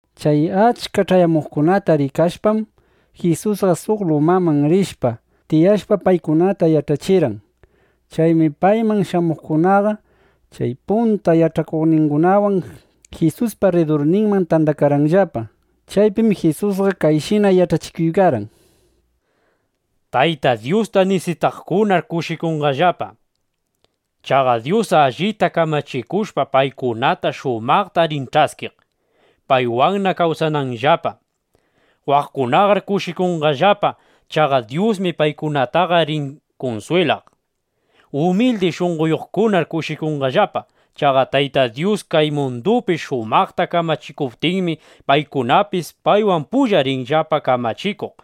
Chay achka ch'ayamuqkunata rikashpam, Jisusqa suq lumaman rishpa, tiyashpa, paykunata yach'achirqan. Chaymi payman shamuqkunaqa chay punta yach'akuqningunawan Jisuspa rridurninman tandakarqanllapa. Chaypim Jisusqa kayshina yach'achikurqan: —Tayta Dyusta nisitaqkunar kushikunqallapa. Chaqa Dyus allita kamachikushpa, paykunata shumaqta rin ch'askiq, paywanna kawsananllapa. ’Waqaqkunar kushikunqallapa. Chaqa Dyusmi paykunataqa rin kunswilaq. ’Umildi shunqoyuqkunar kushikunqallapa. Chaqa Tayta Dyus kay mundupi shumaqta kamachikuptinmi, paykunapis paywan pulla rinllapa kamachikuq.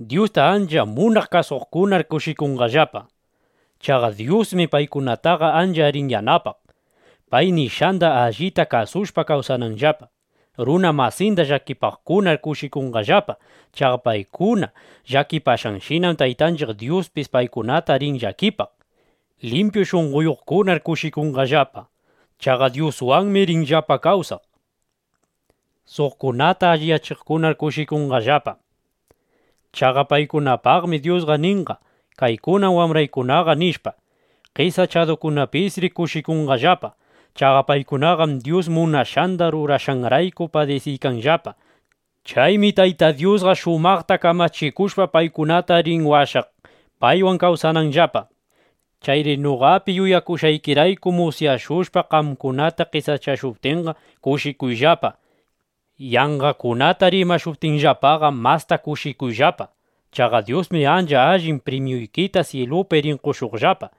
’Dyusta ancha munaq kasuqkunar kushikunqallapa. Chaqa Dyusmi paykunataqa ancha rin yanapaq, pay nishqanda allita kasushpa kawsananllapa. ’Runa masinda llakipaqkunar kushikunqallapa. Chaqa paykuna llakipashqanshinam Taytanchiq Dyuspis paykunata rin llakipaq. ’Limpyu shunqoyuqkunar kushikunqallapa. Chaqa Dyuswanmi rinllapa kawsaq. ’Suqkunata alliyachiqkunar kushikunqallapa. Chaqa paykunapaqmi Dyusqa ninqa: “Kaykunam wambraykunaqa”, nishpa. ’Qesachadukunapisri kushikunqallapa. Chaqa paykunaqam Dyus munashqanda rurashqanrayku padisiykanllapa. Chaymi Tayta Dyusqa shumaqta kamachikushpa, paykunata rin washaq, paywan kawsananllapa. ’Chayri noqapi yuyakushqaykirayku musyashushpa, qamkunata qesachashuptinqa, kushikuyllapa. Yanqakunata rimashuptinllapaqa, masta kushikuyllapa. Chaqa Dyusmi ancha allin primyuykita syilupi rin qoshuqllapa.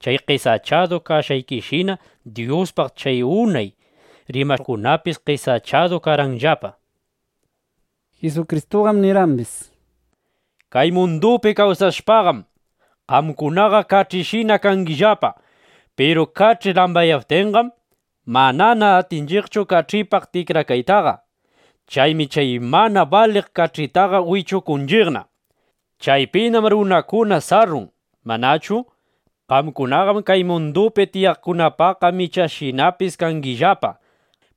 Chay qesachadu kashqaykishina Dyuspaq chay unay rimaqkunapis qesachadu karqanllapa. Jisukristuqam nirqambis: —Kay mundupi kawsashpaqam, qamkunaqa kach'ishina kangillapa. Piru kach'i lambaqyaptinqam, manana atinchu kach'ipaq tikrakaytaqa. Chaymi chay mana baliq kach'itaqa wichukunchiqna. Chaypinam runakuna sarrun, ¿manachu? ’Qamkunaqam kay mundupi tiyaqkunapaqqa michashinapis kangillapa,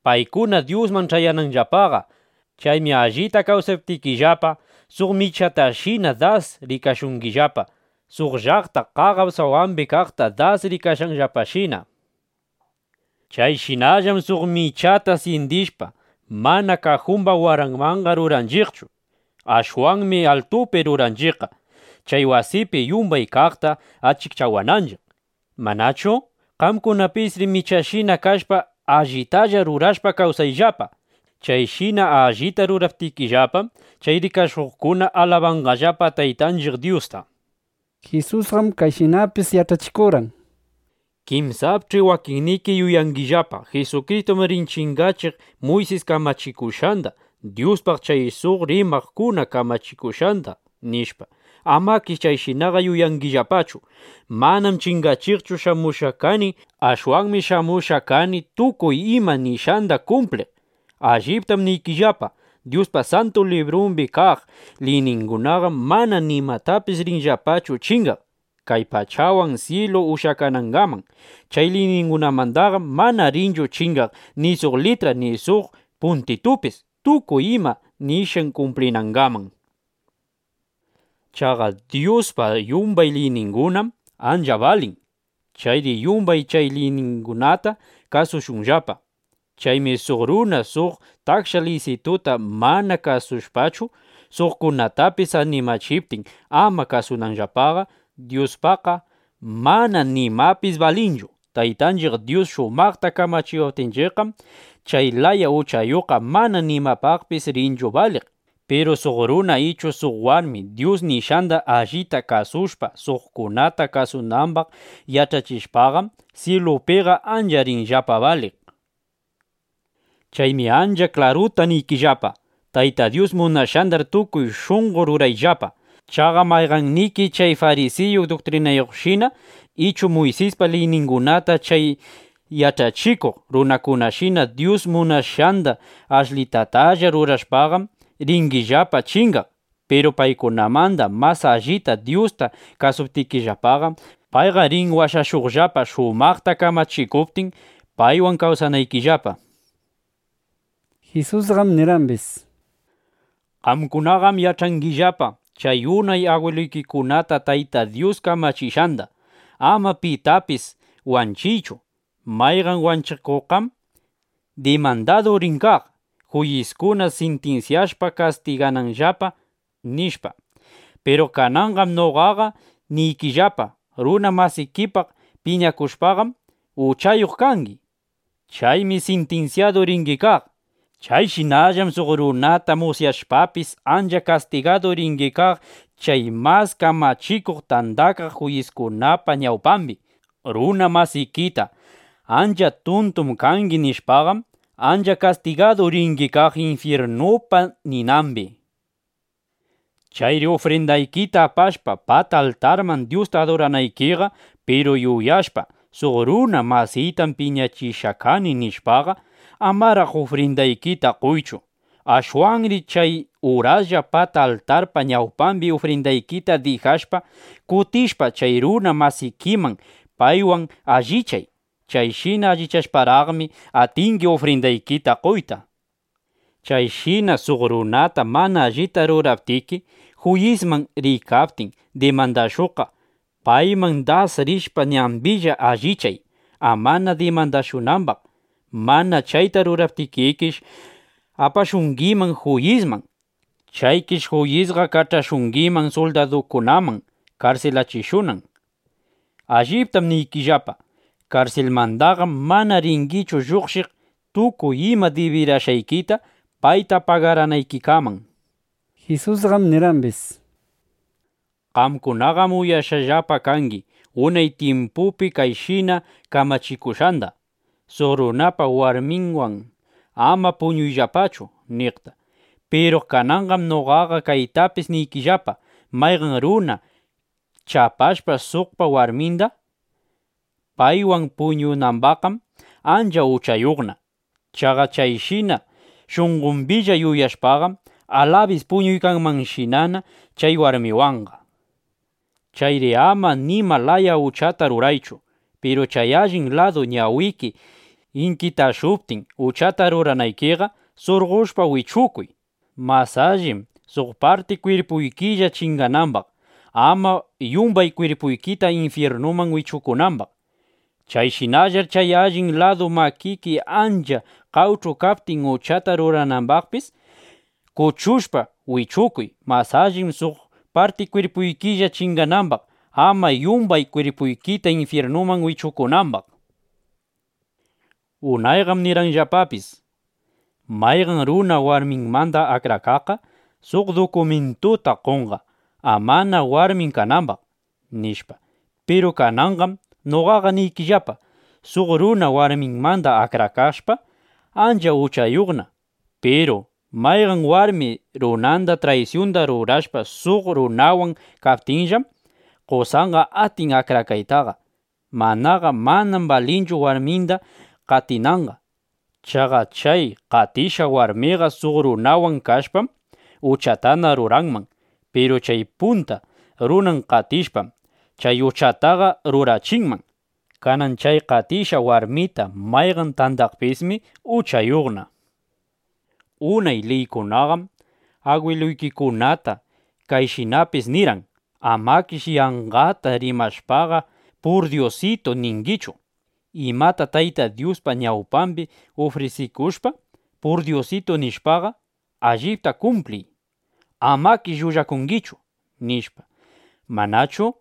paykuna Dyusman ch'ayananllapaqa. Chaymi allita kawsaptikillapa, suq michatashina das rikashungillapa, suq llaqta qaqap sawambi kaqta das rikashqanllapashina. Chayshinallam suq michata syindishpa, mana kajumba waranmanqa ruranchiqchu. Ashwanmi altupi ruranchiqqa, chay wasipi yumbay kaqta achikchawananchiq, ¿manachu? Qamkunapisri michashina kashpa, allitalla rurashpa kawsayllapa. Chayshina allita ruraptikillapam, chay rikashuqkuna alabanqallapa Taytanchiq Dyusta. Jisusqam kayshinapis yach'achikurqan: —Kinsapch'i wakinniki yuyangillapa: Jisukristum rin chingachiq Muysis kamachikushqanda, Dyuspaq chay suq rimaqkuna kamachikushqanda, nishpa. Amakish chayshinaqa yuyangillapachu. Manam chingachiqchu shamushqaqa kani. Ashwanmi shamushqaqa kani, tukuy ima nishqanda kumpliq. Alliptam niykillapa, Dyuspa Santu Librumbi kaq liyningunaqam mana nimapis rinllapachu chingaq, kay pachawan syilu ushyakanangaman. Chay liyningunamandaqam mana rinchu chingaq ni suq litra ni suq puntitupis, tukuy ima nishqan kumplinangaman. Chaqa Dyuspa yumbay liyningunam ancha balin. Chayri yumbay chay liyningunata kasushunllapa. Chaymi suq runa suq taksha liysituta mana kasushpachu, suqkunatapis animachiptin ama kasunanllapaqa, Dyuspaqqa mana nimapis balinchu. Taytanchiq Dyus shumaqta kamachiwaptinchiqqam, chay laya uchayuqqa mana nimapaqpis rinchu baliq. Piru suq runa ichu suq warmi Dyus nishqanda allita kasushpa, suqkunata kasunambaq yach'achishpaqam, syilupiqa ancha rinllapa baliq. Chaymi ancha klaruta niykillapa, Tayta Dyus munashqandar tukuy shunqo rurayllapa. Chaqa mayqanniki chay farisiyu duktrinayuqshina ichu Muysispa liyningunata chay yach'achikuq runakunashina Dyus munashqanda ashlitatalla rurashpaqam, ringillapa chingaq. Piru paykunamanda mas allita Dyusta kasuptikillapaqam, payqa rin washashuqllapa, shumaqta kamachikuptin, paywan kawsanaykillapa. Jisusqam nirqambis: —Qamkunaqam yach'angillapa chay unay agwiluykikunata Tayta Dyus kamachishqanda: “Ama pitapis wanchiychu. Mayqan wanchikuqqam dimandadu rin kaq, juyiskuna sintinsyashpa kastigananllapa”, nishpa. Piru kananqam noqaqa niykillapa, runa masikipaq piñakushpaqam, uchayuq kangi. Chaymi sintinsyadu ringi kaq. Chayshinallam suq runata musyashpapis, ancha kastigadu ringi kaq chay Mas Kamachikuq Tandakaq Juyiskunapa ñawpambi. Runa masikita: “Ancha tuntum kangi” nishpaqam, ancha kastigadu ringi kaq infyirnupa ninambi. ’Chayri ufrindaykita apashpa pata altarman Dyusta aduranaykiqa, piru yuyashpa: Suq runa masiytam piñachishqa kani, nishpaqa, amaraq ufrindaykita qoychu. Ashwanri chay uraslla pata altarpa ñawpambi ufrindaykita dijashpa, kutishpa chay runa masikiman, paywan allichay. Chayshina allichashparaqmi, atingi ufrindaykita qoytaqa. ’Chayshina suq runata mana allita ruraptiki, juyisman riykaptin dimandashuqqa, payman das rishpa, ñambilla allichay, amana dimandashunambaq. Mana chayta ruraptikikish, apashungiman juyisman. Chaykish juyisqa kach'ashungiman suldadukunaman karsilachishunan. ¡Alliptam niykillapa, karsilmandaqam mana ringichu lluqshiq, tukuy ima dibirashqaykita payta pagaranaykikaman! Jisusqam nirqambis: —Qamkunaqam uyakushqallapa kangi unay tyimpupi kayshina kamachikushqanda: “Suq runapa warminwan ama puñuyllapachu”, niqta. Piru kananqam noqaqa kaytapis niykillapa, mayqan runa chapashpa suqpa warminda, paywan puñunambaqqam ancha uchayuqna. Chaqa chayshina shunqombilla yuyashpaqam, alabis puñuykanmanshinana chay warmiwanqa. ’Chayri ama nima laya uchata ruraychu. Piru chay allin ladu ñawiki inkitashuptin uchata ruranaykiqa, surqoshpa wichukuy. Mas allim suq parti kwirpuykilla chinganambaq, ama yumbay kwirpuykita infyirnuman wichukunambaq. Chayshinallar chay allin ladu makiki ancha qawch'u kaptin uchata ruranambaqpis, kuchushpa wichukuy. Mas allim suq parti kwirpuykilla chinganambaq, ama yumbay kwirpuykita infyirnuman wichukunambaq. ’Unayqam nirqanllapapis: “Mayqan runa warminmanda akrakaqqa, suq dukumintuta qonqa, amana warmin kanambaq”, nishpa. Piru kananqam noqaqa niykillapa, suq runa warminmanda akrakashpa, ancha uchayuqna. Piru mayqan warmi runanda traysyunda rurashpa, suq runawan kaptinllam, qosanqa atin akrakaytaqa. Manaqa manam balinchu warminda qatinanqa. Chaqa chay qatishqa warmiqa suq runawan kashpam, uchatana ruranman. Piru chay punta runan qatishpam, chay uchataqa rurachinman. Kanan chay qatishqa warmita mayqan tandaqpismi uchayuqna. ’Unay liykunaqam agwiluykikunata kayshinapis nirqan: “Amakish yanqata rimashpaqa: ‘purdyusitu’ ningichu. Imata Tayta Dyuspa ñawpambi ufrisikushpa, ‘purdyusitu’ nishpaqa, allipta kumpliy. Amakish llullakungichu”, nishpa, ¿manachu?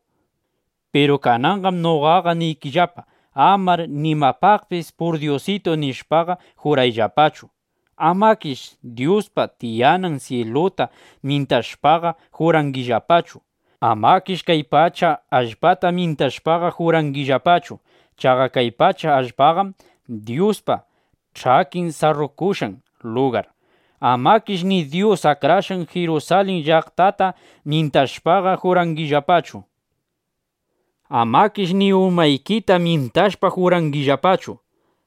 Piru kananqam noqaqa niykillapa, amar nimapaqpis “purdyusitu” nishpaqa, jurayllapachu. Amakish Dyuspa tiyanan syiluta myintashpaqa jurangillapachu. Amakish kay pacha allpata myintashpaqa jurangillapachu. Chaqa kay pacha allpaqam Dyuspa ch'akin sarrukushqan lugar. Amakish ni Dyus akrashqan Jirusalin llaqtata myintashpaqa jurangillapachu. Amakish ni umaykita myintashpa jurangillapachu.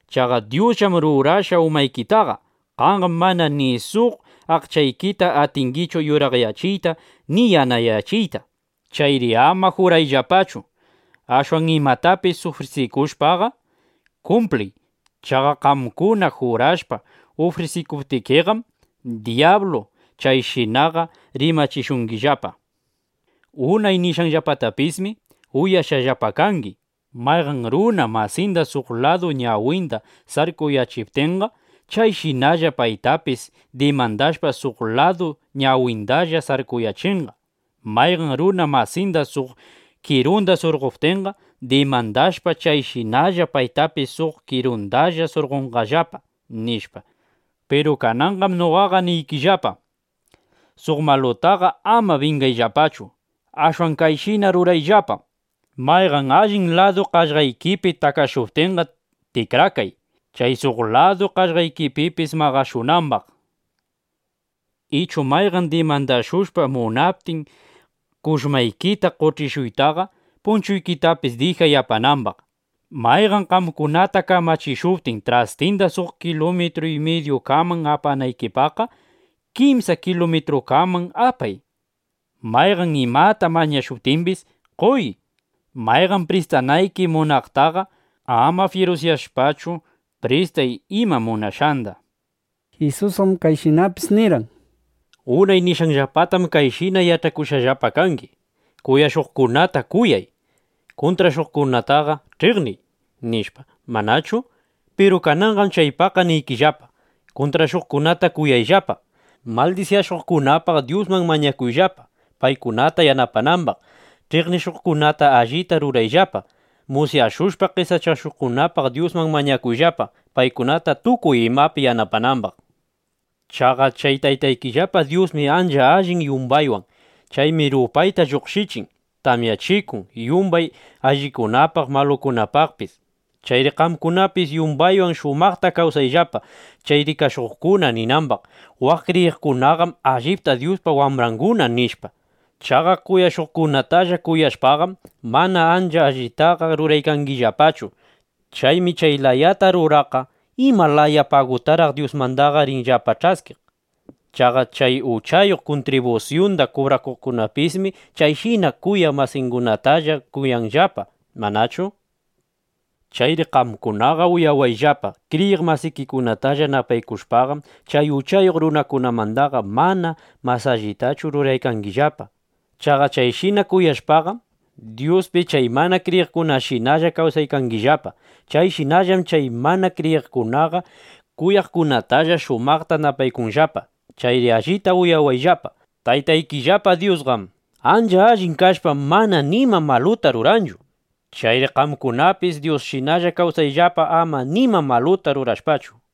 Chaqa Dyusllam rurashqa umaykitaqa. Qamqam mana ni suq aqchaykita atingichu yuraqyachiyta ni yanayachiyta. Chayri ama jurayllapachu. Ashwan imatapis ufrisikushpaqa kumpliy. Chaqa qamkuna jurashpa ufrisikuptikiqam, dyablu chayshinaqa rimachishungillapa. ’Unay nishqanllapatapismi uyashqallapa kangi: “Mayqan runa masinda suq ladu ñawinda sarkuyachiptinqa, chayshinalla paytapis dimandashpa, suq ladu ñawindalla sarkuyachinqa. Mayqan runa masinda suq kirunda surqoptinqa, dimandashpa, chayshinalla paytapis suq kirundalla surqonqallapa”, nishpa. Piru kananqam noqaqa niykillapa, suq malutaqa ama bingayllapachu. Ashwan kayshina rurayllapa: Mayqan allin ladu qaqllaykipi takashuptinqa, tikrakay, chay suq ladu qaqllaykipipis maqashunambaq. Ichu mayqan dimandashushpa munaptin kushmaykita qoch'ishuytaqa, punchuykitapis dijay apanambaq. Mayqan qamkunata kamachishuptin, trastinda suq kilumitru y midyukaman apanaykipaqqa, kimsa kilumitrukaman apay. Mayqan imata mañashuptimbis, qoy. Mayqan pristanayki munaqtaqa, ama fyirusyashpachu, pristay ima munashqanda, nishpa. Jisusqam kayshinapis nirqan: —Unay nishqanllapatam kayshina yach'akushqallapa kangi: “Kuyashuqkunata kuyay. Kuntrashuqkunataqa ch'iqniy”, nishpa, ¿manachu? Piru kananqam chaypaqqa niykillapa, kuntrashuqkunata kuyayllapa. Maldisyashuqkunapaq Dyusman mañakuyllapa, paykunata yanapanambaq. Ch'iqnishuqkunata allita rurayllapa. Musyashushpa, qesachashuqkunapaq Dyusman mañakuyllapa, paykunata tukuy imapi yanapanambaq. Chaqa chay Taytaykillapa Dyusmi ancha allin yumbaywan. Chaymi rupayta lluqshichin, tamyachikun yumbay allingunapaq, malukunapaqpis. Chayri qamkunapis yumbaywan shumaqta kawsayllapa, chay rikashuqkuna ninambaq: “Waq kriyiqkunaqam allipta Dyuspa wambranguna”, nishpa. Chaqa kuyashuqkunatalla kuyashpaqam, mana ancha allitaqa ruraykangillapachu. Chaymi chay layata ruraqqa ¿ima laya pagutaraq Dyusmandaqa rinllapa ch'askiq? Chaqa chay uchayuq kuntribusyunda kubrakuqkunapismi chayshina kuyaq masingunatalla kuyanllapa, ¿manachu? Chayri qamkunaqa uyawayllapa, kriyiq masikikunatalla napaykushpaqam, chay uchayuq runakunamandaqa mana mas allitachu ruraykangillapa. Chaqa chayshina kuyashpaqam, Dyuspi chay mana kriyiqkunashinalla kawsaykangillapa. Chayshinallam chay mana kriyiqkunaqa kuyaqkunatalla shumaqta napaykunllapa. Chayri allita uyawayllapa: Taytaykillapa Dyusqam ancha allin kashpa, mana nima maluta ruranchu. Chayri qamkunapis Dyusshina kawsayllapa, ama nima maluta rurashpachu.